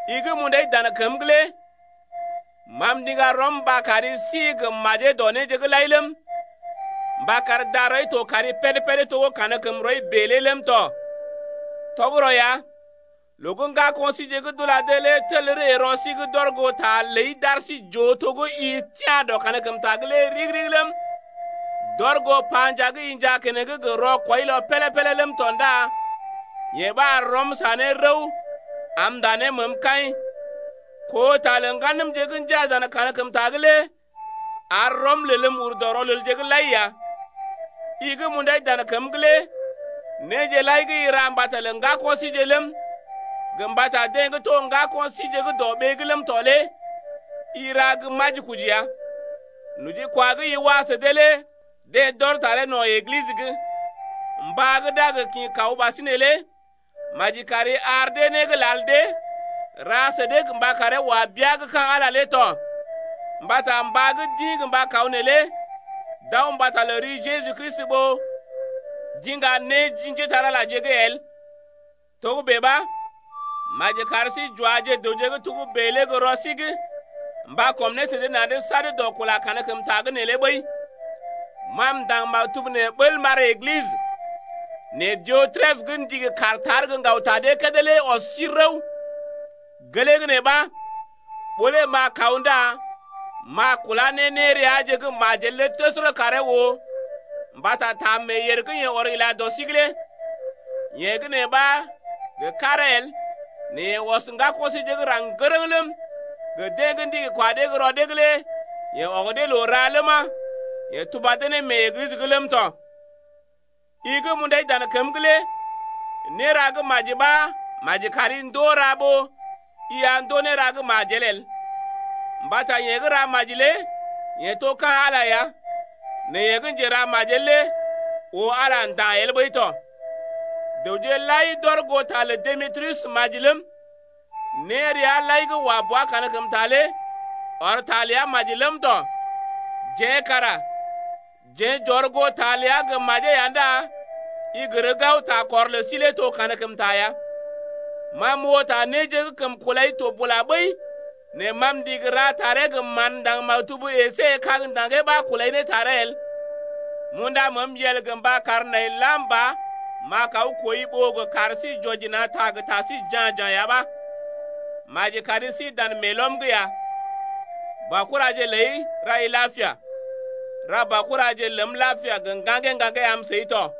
I gə́ m’undai dan kəm’g lé ma m’ndiŋga rɔm mba kar i si gə́ majee dɔ néje’g lai ləm, mba kar darɔi to maji péd-péd to gə́ kankəmrɔi bèe lé ləm tɔ. Tɔgərɔ ya, loo gə́ ŋgako̰ síje gə́ d’ula dee lé tel ree rɔ sí’g d’ɔr goo ta ləi d’ar sí j’oo to gə́ i tia̰ dɔ kankəmta’g lé ɗigi-ɗigi ləm, d’ɔr goo panjaa gə́ i njaa keneŋ gə rɔkwɔilɔ pélé-pélé ləm tɔ ndá yee ɓa ar rɔm sa ne rəw am m’ndá ne məəm kaḭ. Koo ta lə ŋganəmje gə́ njaa dan kankəmta’g lé ar rɔm lelm ur dɔ rɔlelje’g lai ya. I gə́ m’undai dan kəm’g lé néje lai gə́ i ra mbata lə ŋgako̰ síje ləm, gə mbata deḛ gə́ to ŋgako̰ síje gə́ dɔ ɓee’g ləm tɔ lé i ra gə majikoji ya. Nojikwa gə́ i wa sə dee lé deḛ d’ɔr taree no̰ Eglisə’g. Mbá gə́ d’a gə kḭ kaw ɓasinè lé maji kari ar dee né gə́ lal dee, ra sə dee mba karee wa bea gə́ ka̰ Ala tɔ. Mbata mbá gə́ d’ḭ mba kaw neelé d’aw mbata lə ri Jeju Kristi ɓó d’iŋga né ji njépole-magəje’g el. Togə́bè ɓa, maji kar sí j’waje dəwje gə́ togə́bè lé gə́ rɔ sí’g mba kɔm ne sə dee na̰’d sad dɔ kula kankəmta’g neelé ɓəi. Ma m’ndaŋg maktub nee bəl m’ar Eglisə, nɛ Diotrepə gə́ ndigi kaar gə́ ŋgaw-ta dee kédé lé ɔs sí rəw. Gelee gə́ nee ɓa, ɓó lé m’a kaw ndá m’a kulá ne néreaje gə́ majel lé təsərə karee oo mbata ta meeyèr gə́ yeḛ ɔr ila dɔ sí’g lé. Yee gə́ nee ɓa gə karee el nɛ yeḛ ɔs ŋgako̰ síje gə́ raŋg ŋgərəŋ ləm, deḛ gə́ ndigi kwa dee gə́ rɔ dee’g lé yeḛ ɔg dee loo ra ləma, yeḛ tuba dee mee Eglisə’g ləm tɔ. I gə́ m’undai dan kəm’g lé néra gə́ maji ɓa maji kari ndoo ra ɓó i a ndoo néra gə́ majel el. Mbata yeḛ gə́ ra maji lé yeḛ to ka̰ Ala ya. Nɛ yeḛ gə́ njeramajel lé oo Ala nda̰ el ɓəi tɔ. Dəwje lai d’ɔr goo ta lə Demetriyus maji ləm, néreaje lai gə́ wa bua kankəmta lé ɔr ta ləa maji ləm tɔ. Jeḛ kara jeḛ j’ɔr goo ta ləa gə́ majee ya ndá i gər gao takɔr lə sí lé to kankəmta ya. Ma m’oo ta néje gə́ kəm kulai to bula ɓəi, nɛ ma m’ndigi ra taree gə mán ndaŋg maktub əsé kag ndaŋgee ɓa kulai ne taree el. M’unda məəm yel gə mba kar nai lam ba m’a kaw kooi ɓó gə kar sí j’wɔji na̰ ta gə ta sí ja̰-ja̰ ya ɓa. Maji kari si dan meelɔm’g ya. Baokuraje ləi rai lapia. Ra baokuraje ləm lapia gə ŋgaŋgee-ŋgaŋgee am səi tɔ.